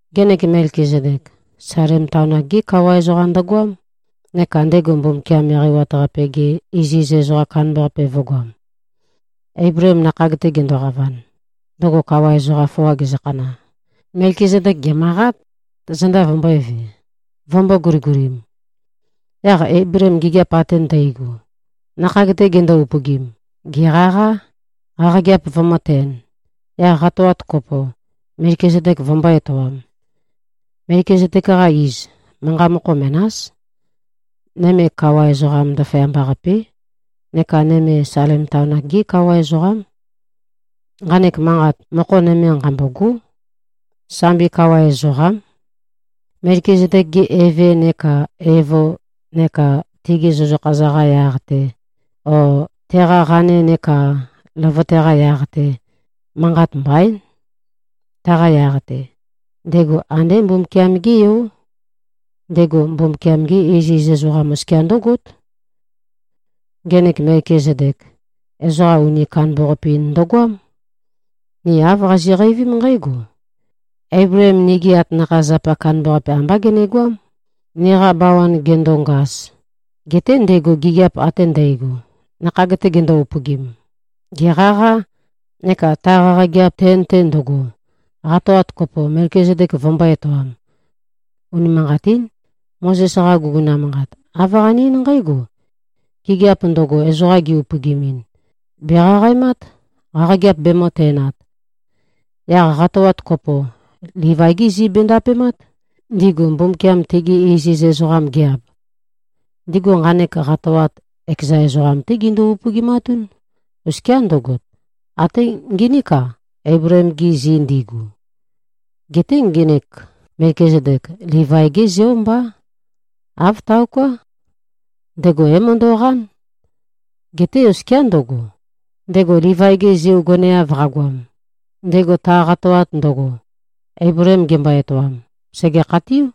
Ngenek Melkizedek, Salem taon-ak-gé kawa ezoqam ndøgoám, neka ndego Mbumbukiam Eqeiwat-Qape-ge iziz ezoqam kandambaqape vø̄goam. Eibleem nakhag-te gendoqavan, ndøgo kawa ezoqa foa gezøkhana, Melkizedek gèmøqát, zenda vømbø̄eve, vømbō-guligulim. Yaq Eibleem gigiap ate ndægo, nakhag-te gendo-upøgim, gèqaqá, qaqageap vømø̄-ten, yaq qatoat kopo, Melkizedek vømbō-etoam. (Melkizedek-qa iz, manqa mokho menás: Nøme, kawa ezoqam ndaføyamba-qapé. Neka nøme, Salem taon-ak-gé kawa ezoqám. Nqanek manqat, mokho nøme nqambógo: Sambi kawa ezoqám.) Melkizedek-ge eve neka evo neka tegi zøzøkha-za-qa yaq-te o teqa qane neka løvøte-qa yaq-te, manqat mbaín. Taqa yaq-te, ndego andé Mbumbukiam-gé Yó. Ndego Mbumbukiam-ge iziz ezoqam oskia ndǿgót. Ngenek Melkizedek, ezoqa uni kandambaqape-in ndøgoám. Ni āv qazi꞉qeivím nqǽgo: Eibleem nigi atanakha-zapa kandambaqape ambá genegoám, niqa bawan gendongaz, geté ndego gigiap ate ndægo, nakhag-te gendo-upøgim, gèqaqá, neka ta qaqageap ten-te ndøgo, qatoat kopo, Melkizedek vømbō-etoam. Unimanqatín. Mozes-qa guguna manqat, āv qane-eín nqǽgo: Gigiap ndøgo, ezoqa gi-upøgimin, bèqaqaemát, qaqageap bemø̄-ten-at. Yaq qatoat kopo, Livai-gí zi bendapemát, ndigu Mbumbukiam tegi iziz ezoqam gi-ab. Ndigu nqanek qatoat, ekeza ezoqam-té gindu-upøgimatún, oskiá ndøgo, atē nginīk-a, Eibleem-gi zi ndigu. Geté ngenek Melkizedek, Livai-gé zeó mbá. Āv taoká. Ndego é-møndo꞉qán. Geté oskiá ndøgo, ndego Livai-ge zeo goneav qagoam, ndego ta qatoat ndøgo, Eibleem gembo-etoam, sège-khatiú.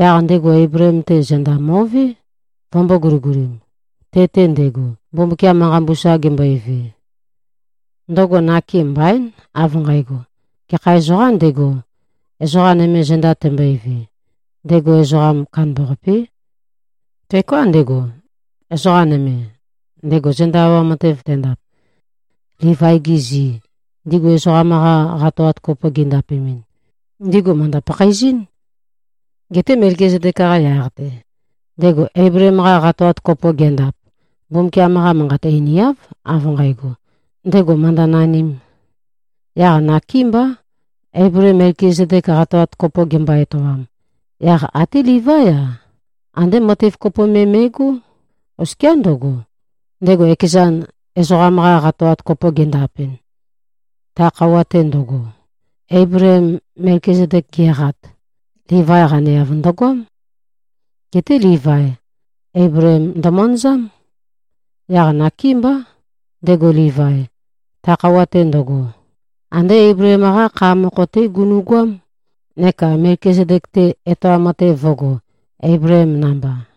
Yaq ndego Eibleem-te, zenda mo꞉vé, vømbō-guligulim, te-te ndego, Mbumbukiam manqa mbusa gembøeve. Ndøgo nake mbaín, av nqægo: Gekha ezoqām ndego, ezoqa nøme zenda tembøeve, ndego ezoqa kandambaqapé. Teoká ndego, ezoqa nøme, ndego zenda awam matev tendap. Livai-gi zi, ndigu ezoqam-qa qatoat kopo gindapemɨn, ndigu mø̀ndø-pakhaezɨ́n. Geté Melkizedek-qa yaq-te, ndego Eibleem-qa qatoat kopo gendap, Mbumbukiam-qa Manqat einiáv, av nqægo, ndego mø̀ndønanīm. Yaq nakémbá, Eibleem Melkizedek qatoat kopo gembo-etoam, yaq até Livaí-a, andé matev kopo me me꞉gó, oskia ndøgo, ndego ekezan, ezoqam-qa qatoat kopo gendapɨn. Ta khøuwa-te ndøgo, Eibleem Melkizedek geqat, Livai qaneav ndøgoám. Geté Livai, Eibleem ndømanazám. Yaq nakémbá, ndego Livai, ta khøuwa-te ndøgo, andé Eibleem-qá kha mokho-té gunu꞉goám, neka Melkizedek-te, etoam matev vø̄go, Eibleem namba.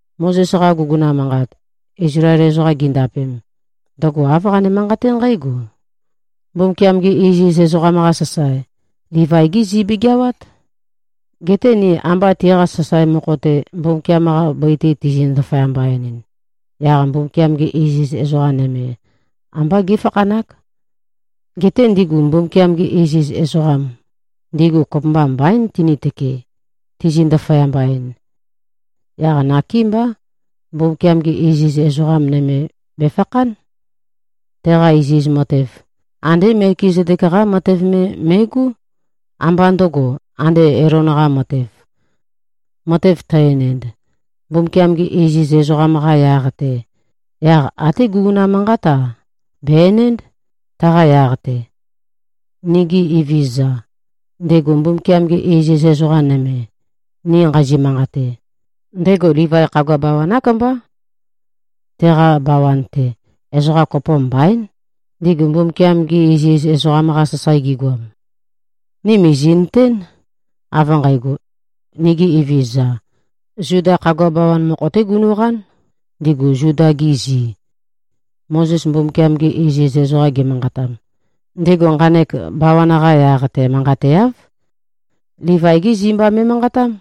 Mozes-qa guguna manqat, Izlael ezoqam gindapem, ndøgo āv qane-manqaté nqǽgo: Mbumbukiam-gi iziz ezoqam-qa sasae, Livai-gí zi begeawát. Geté ni amba tiqa sasae mokho-te, Mbumbukiam-qa bøi-te tizi-ndaføyamba-enɨn, yaq Mbumbukiam-ge iziz ezoqa nøme, ambá géfakhanák. Geté ndigu Mbumbukiam-gi iziz ezoqam, ndigu kopømba mbaín tinitøke, tizi-ndaføyamba-en. Yaq nakémbá, Mbumbukiam-ge iziz ezoqa nøme bèfakhán. Teqa iziz matev, andé Melkizedek-qá matev me me꞉gó, ambá ndø̄go, ande Elon-qā matēv. Matev tø-enend, Mbumbukiam-gi iziz ezoqam-qa yaq-te, yaq até guguna manqát-a, bè-enénd, taqa yaq-te. Nigi Evezøza, ndego Mbumbukiam-ge iziz ezoqa nøme, ni nqazi꞉-manqate, ndego Livai khagua bawan-ák mbá. Teqa bawan-te, ezoqa kopo mbaín, ndigu Mbumbukiam-gi iziz ezoqam-qa sasae gigoam. Ni mìzi꞉nøtén, av nqægo, nigi Evezøza, Zuda khagua bawan mokho-té gunu꞉qán, ndigu Zuda-gi zi. Mozes Mbumbukiam-gi iziz ezoqam ge꞉manqatam, ndego nqanek bawan-qa yaq-te manqateáv. Livai-gí zi mba me꞉manqatám.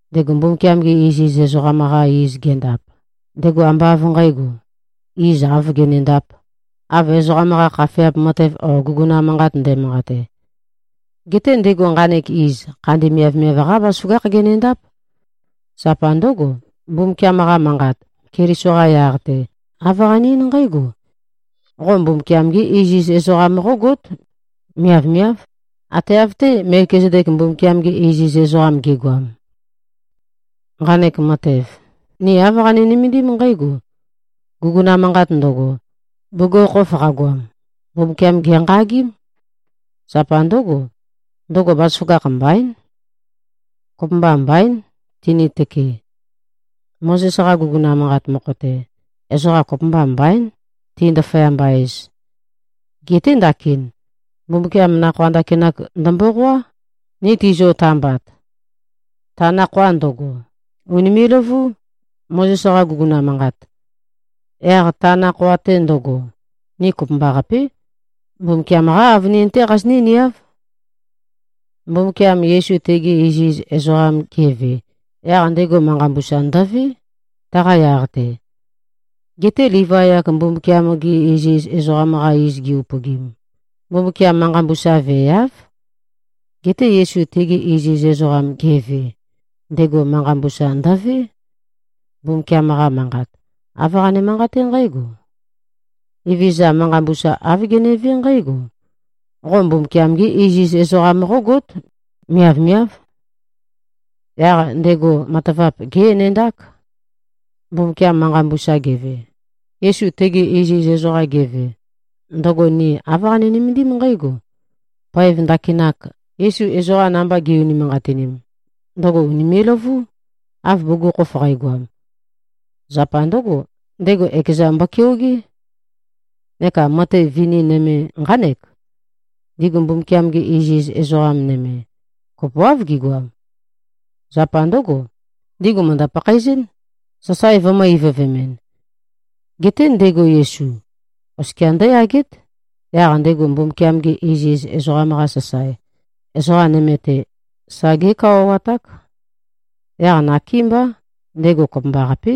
Ndego Mbumbukiam-ge iziz ezoqam-qa iz gendap, ndego ambá av nqǣgo, iz āv genendāp, av ezoqam-qa khafeap matev o guguna manqat ndæmanqate. Geté, ndego nqanek iz, khandi miavmiav-qá bazaføgákh genendáp. Zapa ndǿgo, Mbumbukiam-qa manqat, Keliso-qa yaq-te, āv qane-eín nqǽgo, “Qo Mbumbukiam-gé iziz ezoqam qógót, miavmiáv, ate av-té, Melkizedek Mbumbukiam-ge iziz ezoqam ge꞉goam.” Nqanek matev, ni āv qani-nømendím nqǽgo: Guguna manqat ndøgo, bugukhokhof qagoam, Mbumbukiam gènqagím. Zapa ndǿgo, ndøgo bazaføgakh mbaín. Kopømba mbaín, tønitøke. Mozes-qa guguna manqat mokho-te, ezoqa kopømba mbaín, ti-ndaføyamba-ez. Geté ndakin, Mbumbukiam nakhoa ndakinak ndømboqoá, ni tizio-tambat. Ta nakhoa ndøgo, ùnime꞉-løvú, Mozes-qa guguna manqat. Yaq ta nakhoa-te ndøgo, ni kopømbaqapé, Mbumbukiam-qá avønin-té qazinǿ-niáv. Mbumbukiam Yesu tege iziz ezoqam geve, yaq ndego manqa mbusa ndøvé, taqa yaq-te. Geté Livai-ak Mbumbukiam-gi iziz ezoqam-qa iz gi-upøgim, Mbumbukiam manqa mbusa veeáv. Geté Yesu tege iziz ezoqam geve, ndego manqa mbusa ndøvé. Mbumbukiam-qa Manqat, āv qane-manqaté nqǽgo, “Evezøza manqa mbusa, āv genevé nqǽgo: Qo Mbumbukiam-gé iziz ezoqam qógót. Miavmiáv.” Yaq ndego matavap gé-enendák. Mbumbukiam manqa mbusa geve, Yesu tege iziz ezoqam geve, ndøgo ni āv qani-nømendím nqǽgo: Poev ndakinak, Yesu ezoqa namba ge꞉-unimanqatin, ndøgo ùnime꞉-løvú, av bugukhokhof qægoam. Zapa ndǿgo, ndego ekezan mbokeogé. Neka matev vini nøme nqánek: Ndigu Mbumbukiam-gi iziz ezoqam nøme, kopoáv gigoam. Zapa ndǿgo, ndigu mø̀ndø-pakhaezɨ́n, sasae vømø̄-ivøvemɨn. Geté, ndego Yesu, oskia ndǿyagét, yaq ndego Mbumbukiam-ge iziz ezoqam-qa sasae, ezoqa nøme-te, sa gékawawaták. Yaq nakémbá, ndego kopømbaqapé,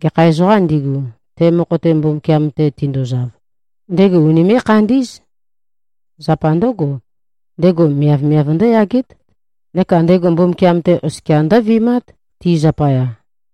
gekha ezoqām ndigu, te mokho-te Mbumbukiam-te tinduzav, ndego unimé꞉-khandí꞉z. Zapa ndǿgo, ndego miavmiav ndǿyagét, neka ndego Mbumbukiam-te oskia ndǿvi꞉mát, ti zapaya.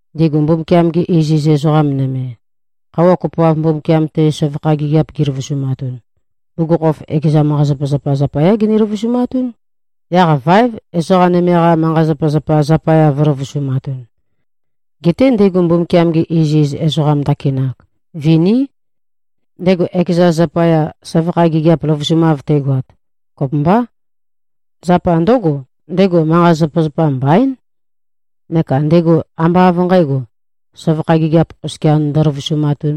Ndigu Mbumbukiam-gi iziz ezoqa nøme, khøuwa kopoav Mbumbukiam-te søvakha gigiap giløvusumatun, bugukhokhof ekeza manqa-zapazapa zapayá gini-løvusumatún, yaq váev, ezoqa nøme-qa manqa-zapazapa zapaya vø̄løvusumatun. Geté ndego Mbumbukiam-ge iziz ezoqam ndakinak, viní. Ndego ekezan zapaya, søvakha gigiap løvusumav tegoat, kopømbá. Zapa ndǿgo, ndego manqa-zapazapa mbaín. Neka ndego ambá av nqǣgo, søvakha gigiap oskia ndøløvusumatūn.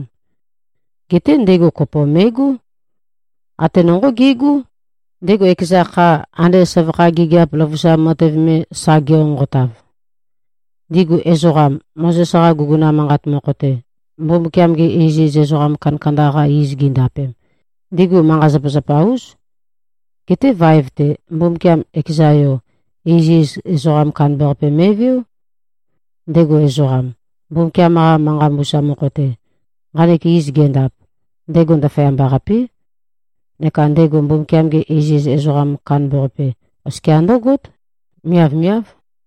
Geté ndego kopo me꞉gó. Ate nonqó ge꞉gó, ndego ekeza kha, ande søvakha gigiap løvusam matev me, sa genqonqotav. Ndigu ezoqam, Mozes-qa guguna manqat mokho-te, Mbumbukiam-gi iziz ezoqa kandakanda-qa iz gindapem, ndigu manqa-zapazapa-ús. Geté vaev-te, Mbumbukiam ekeza Yo, iziz ezoqa kandambaqape me꞉veó. Ndego ezoqam, Mbumbukiam-qa manqa mbusa mokho-te, nqanek iz gendap, ndego ndaføyamba-qapé. Neka ndego Mbumbukiam-ge iziz ezoqam kandambaqape, oskia ndǿgót. Miavmiáv.